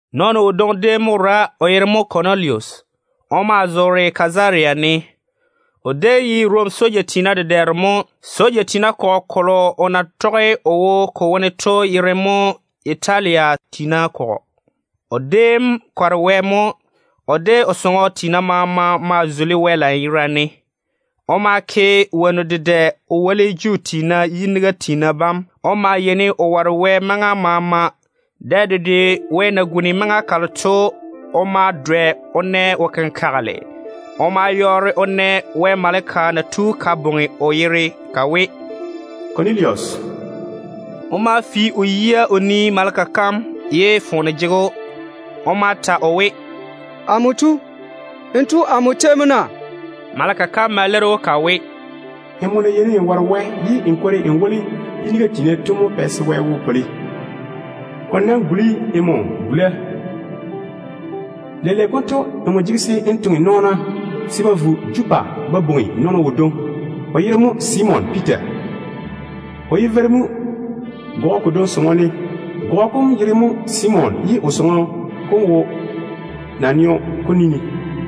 Nɔɔno wodwoŋi déem mo wora, o yere mo Kɔnilusi. O maa zoore Kazaria ne. O déem ye Rom soja tiina dedɛɛro mo. Soja tiina kɔgɔ kolo o na tɔge o wo ko wone to yere mo ‘Yitalia tiina kɔgɔ’. O déem kɔre Wɛ mo. O de o sɔŋɔ tiina maama maa zuli Wɛ lanyerane. O maa woli Juu tiina balo yiniga na jege-ba to. O maa yeini o ware Wɛ maŋa maama. Dɛ dedwe wɛ na guni maŋa kalo to, o ma dwɛ o na wo-kenkagele. O ma yɔɔre o na Wɛ maleka na tu ka bwoŋi o yere ka we, “Kɔnilusi!” O ma fi o yia o nii maleka kam seeni ye foone jege‑o. O ma ta o we, “Amo tu, n tu amo tei mo na?” Maleka kam ma leiri‑o ka we, “Nmo na yeini n ware Wɛ ye n kwori n woli yiniga tiina to mo pɛ se n kikia yam konto su Wɛ yi. O nam guli nmo gula mo. Leile konto nmo jege se n toŋe nɔɔna se ba vo Jopa ba bwoŋi nɔɔno wodwoŋi, o yere mo Simon Piita. O ye veiru mo gɔgɔ kodwoŋi sɔŋɔ ne. Gɔgɔ kom yere mo Simon. O sɔŋɔ kom maa wo naneo kom ni ne.”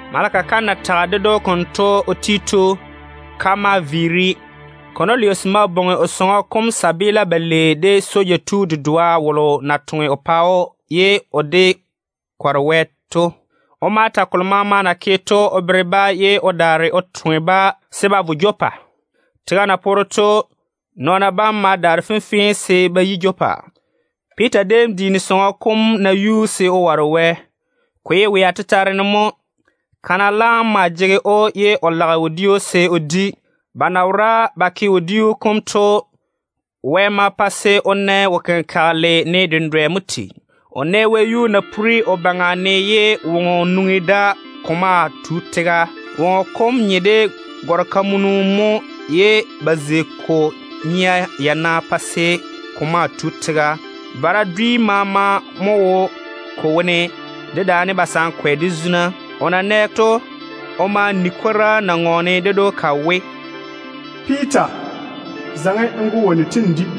Maleka kam na tage konto ka ti to, ka ma viiri. Kɔnilusi ma bwoŋi o sɔŋɔ kom tontoŋena balei, de soja tu dedoa wolo na toŋe o pa‑o ye o de kɔre Wɛ to. O ma ta kolo maama na ke to o bere-ba ye o daare o toŋe-ba se ba vo Jopa. Tega na poore to, nɔɔna bam ma daare fenfee se ba yi Jopa. Piita déem diini sɔŋɔ kom nayuu se o ware Wɛ. Ko ye wea tetare ne mo. Kana laam maa jege‑o ye o lage wodiu se o di. Ba na wora ba ke wodiu kom to, Wɛ ma pa se o na wo-kenkagele ne dendwɛ mo tei. O nɛ wɛyuu na pore o baŋa ne ye woŋo nwoŋi da ko maa tu tega. Woŋo kom nye de gɔr-kamunu mo ye ba zei ko nia yana pa se ko maa tu tega. Vara dwi maama mo tigi ko wone, dedaane tega-veila, de zuna. O na nɛ to, o ma ni kwora na ŋɔɔne ded‑o ka we, “Piita, zaŋe n go wonnu tem n di.”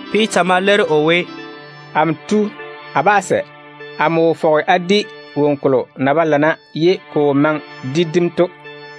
Piita ma leiri o we, “Amo tu, a bá sɛ. Amo wo fɔge a di woŋo kolo na ba lana ye ko wo maŋe de dim to.”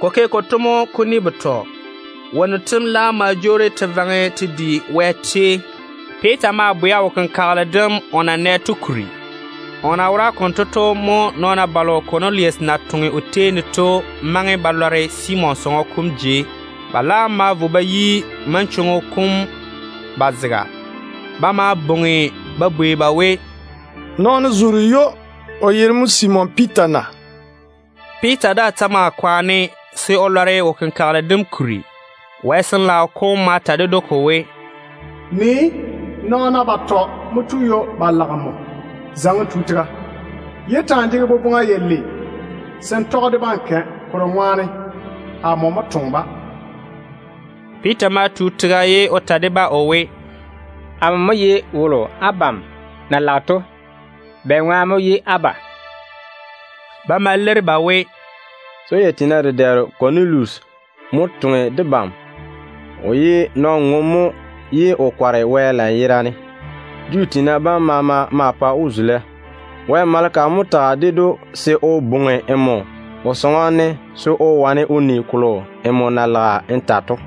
Ko ke konto mo kuni betɔ. Wonnu tem laam ma jwoori te vaŋe te di wɛyuu. Piita maa bwɛa wo-kenkagele dem o na nɛ to kuri. O na wora konto to, mo nɔɔna balo Kɔnilusi na toŋe o tei ne to maŋe ba lɔre Simon sɔŋɔ kom jei. Ba laam ma vo ba yi manchwoŋo kom ba zega. Ba ma bwoŋi ba bwei ba we, “Nɔɔno zoore ywo, o yere mo Simon Piita na?” Piita daa ta maa kwaane se o lɔre wo-kenkagele dem o na nɛ to kuri. Wɛ Sin-laao kom ma ta ded‑o ko we, “Nii! Nɔɔna batɔ mo tu ywo ba lage nmo. Zaŋe n tu tega. Yé ta‑n jege boboŋa yalei se n tɔge de-ba n kɛ, kolo ŋwaane amo mo toŋe-ba.” Piita ma tu tega ye o ta de-ba o we, “Amo mo ye wolo abam na lage to. Bɛŋwaane mo ye á ba?” Ba ma leiri ba we, “Soja tiina dedɛɛro Kɔnilusi mo toŋe debam. O ye nɔn-ŋom mo ye o kɔre Wɛ lanyerane. Juu tiina bam maama maa pa‑o zula. Wɛ maleka mo tage ded‑o se o bwoŋi nmo o sɔŋɔ ne se o wane o ni kolo nmo na lage n ta to.”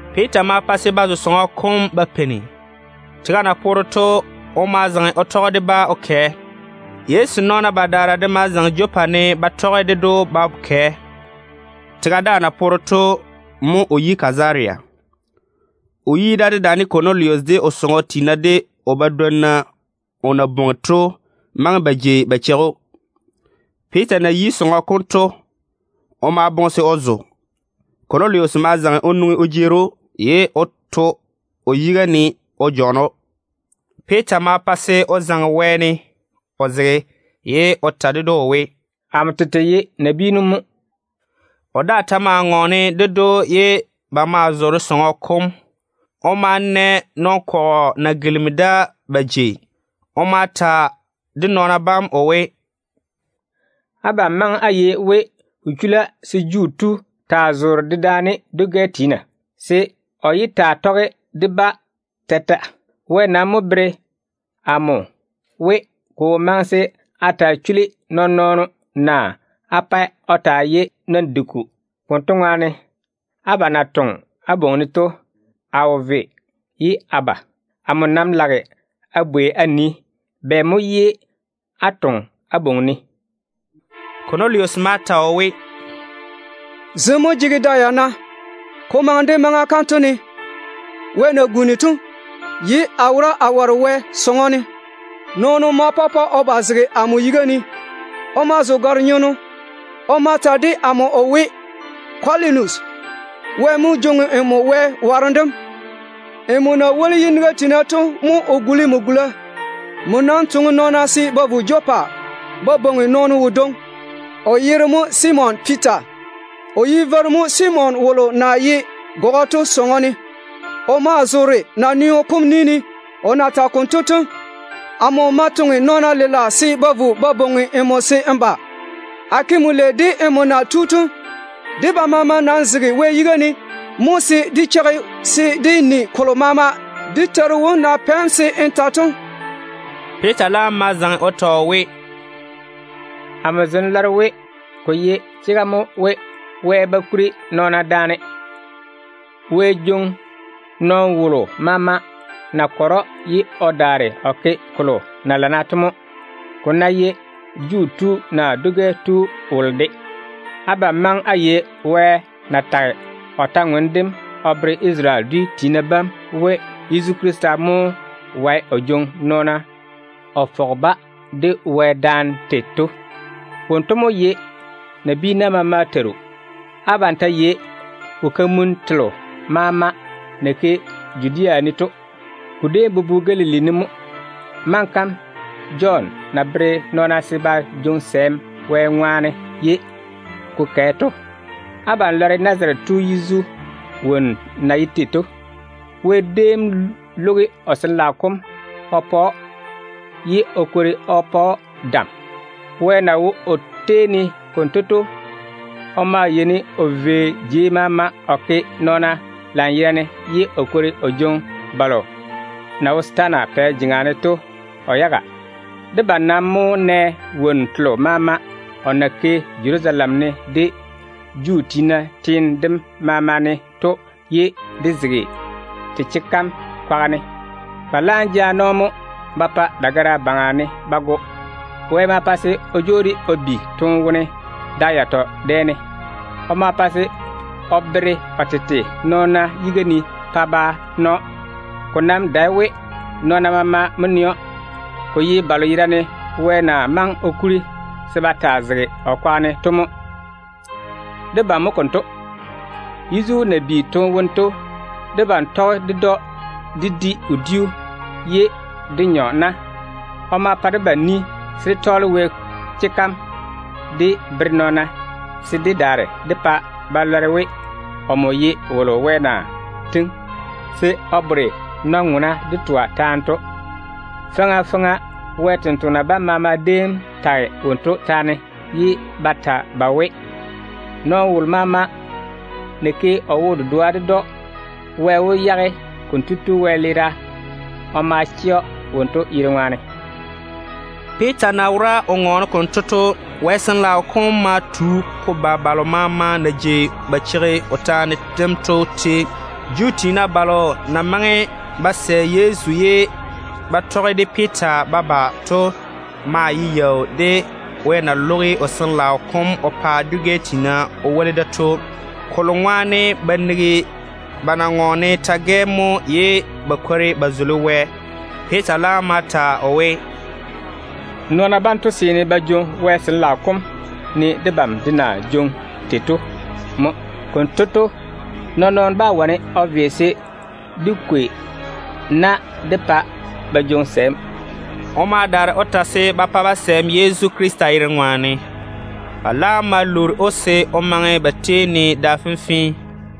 Piita ma pa se ba zo sɔŋɔ kom ba peini. Tega na poore to, o ma zaŋe o tɔge de-ba o kɛ. Yezu nɔɔna badaara de ma zaŋe Jopa ne ba tɔge ded‑o ba kɛ. Tega daa na poore to mo o yi Kazaria. O yi da dedaane Kɔnilusi, de o sɔŋɔ tiina, de o badwonna o na bwoŋi to maŋe ba jei ba cheigi‑o. Piita na yi sɔŋɔ kom to, o maa boŋe se o zo. Kɔnilusi ma zaŋe o nwoŋi o jeeri‑o, ye o daare o to o yiga ne o jɔɔne‑o. Piita ma pa se o zaŋe wɛɛne o zege, ye o ta ded‑o o we, “Amo tete ye nabiinu mo.” O daa ta maa ŋɔɔne ded‑o ye ba maa zoore sɔŋɔ kom. O ma na nɔn-kɔgɔ na gilimi da ba jei. O ma ta de nɔɔna bam o we, “Abam maŋe á yei we ko chula se Juu tu taa zoore dedaane dwi-gɛ tiina, naa o taa tɔge de-ba. Wɛ nam mo bere amo we, ko wo maŋe se a taa chuli nɔɔn-nɔɔno, naa a pae o taa ye nɔn-diku. Konto ŋwaane, abam na toŋe á bwoŋi-ne to, a wo ve ye a ba. Amo nam lage a bwei a nii, bɛ mo ye á toŋe á bwoŋi-ne?” Kɔnilusi ma ta o we, “Zem mo jege da yana, ko maŋe de maŋa kanto ne, wɛ na guni to, ye a wora a ware Wɛ sɔŋɔ ne. Nɔɔno ma pɔpɔ o ba o zege amo yiga ne. O maa zo gare-nyenno. O ma ta de amo o we, ‘Kɔnilusi, Wɛ mo jwoŋi nmo wara yam. Nmo na woli yiniga tiina to ŋwaane mo o guli nmo gula. Nam toŋe nɔɔna se ba vo Jopa ba bwoŋi nɔɔno wodwoŋi, o yere mo Simon Piita. O ye veiru mo Simon wolo na ye gɔgɔ to sɔŋɔ ne. O maa zoore naneo kom ni ne.’ O na tage konto to, a ma toŋe nɔɔna lela se ba vo ba bwoŋi‑m se n ba. A ke nmo lei de nmo na tu to. Debam maama nam zege Wɛ yiga ne mo dé cheigi se dé ni kolo maama dé Teiru wom na pɛ‑m se n ta to.” Piita laam ma zaŋe o ta o we, “Amo zem lɔre we ko ye chega mo we Wɛ ba kuri nɔɔna daane. Wɛ jwoŋi nɔɔno wolo maama na kɔre‑o ye o daare o ke kolo na tɔge chwoŋa to mo, ko ná ye Juu tu naa dwi tu wolo de. Abam maŋe á yei Wɛ kwor-ywoŋa kam o na toŋe Isarele dwi tiina bam tei ne we Yezu Krista mo wae o jwoŋi nɔɔna o fɔge ba de Wɛ daane tei to. Wonto mo ye nabiina maama Teiru. Abam ta yei wo-kamunnu telo maama na ke Judea ne to. Ko déem bobo Galili ne mo, maŋa kam Jɔn na bere nɔɔna se ba jwoŋi sɛɛm Wɛ ŋwaane ye ko kɛ to. Abam lɔre Nazarete tu Yezu yera seina na ye tei to. Wɛ déem lwogi o Sin-laao kom o yera ne ye o kwori o pa‑o dam. Wɛ na wo o tei ne konto to, o maa yeini o vei jei maama o zeini nɔɔna lanyerane, ye o kwori o jwoŋi balo na wo setaana pɛ jeŋa ne to o yaga. Debam nam mo nɛ wonnu telo maama o na ke Jerusalem ne de Juu tiina teene dem maama ne to ye dé zege te chega kam kwaga ne. Ba laam jaane‑o mo ba pa dagara yuu ne ba go. Wɛ ma pa se o jwoori o bi toone wone da yatɔ dɛ ne. O ma pa se o veere o tete nɔɔna yiga ne pa ba na‑o. Ko nam dae we nɔɔna maama mo nɛ‑o, ko ye balo yerane Wɛ na maŋe o kuri se ba taa zege o kwaga ne to mo. Debam mo konto. Yezu na bi toone wone to, debam tɔge ded‑o dé di wodiu ye dé nyɔ na. O ma pa debam ni se dé tɔɔle Wɛ kwora kam dé bere nɔɔna se dé daare dé pa ba lɔre we, omo ye wolo Wɛ na tiŋi se o bore nɔn-ŋwena de twa taane to. Faŋa faŋa Wɛ sampwori sem maama déem tage wonto taane ye ba ta ba we, nɔɔno wolo maama ná ke o wo-dedoa ded‑o, Wɛ wó yage konto tu wɛleera o ma chɛ‑o wonto yere ŋwaane.” Piita ta na wora o ŋɔɔne konto to, Wɛ Sin-laao kom ma tu ko ba balo maama na jei ba cheigi o taane dem to tei. Juu tiina balo na maŋe ba sɛ Yezu ye ba tɔge de Piita ba ba to maa ye yaau de Wɛ na lwogi o Sin-laao kom o pa dwi-gɛ tiina o woli da to. Kolo ŋwaane ba nigi ba na ŋɔɔne ta-gɛ mo ye ba kwori ba zuli Wɛ. Piita laam ma ta o we, “Nɔɔna banto seene ba jwoŋi Wɛ Sin-laao kom ne debam de na jwoŋi tei to mo. Konto to, nɔɔn-nɔɔno bá wane o ve se dé kwei na dé pa ba jwoŋi sɛɛm.” O ma daare o ta se ba pa-ba sɛɛm Yezu Krista yere ŋwaane. Ba laam ma lwoori‑o se o maŋe ba tei ne da fenfee.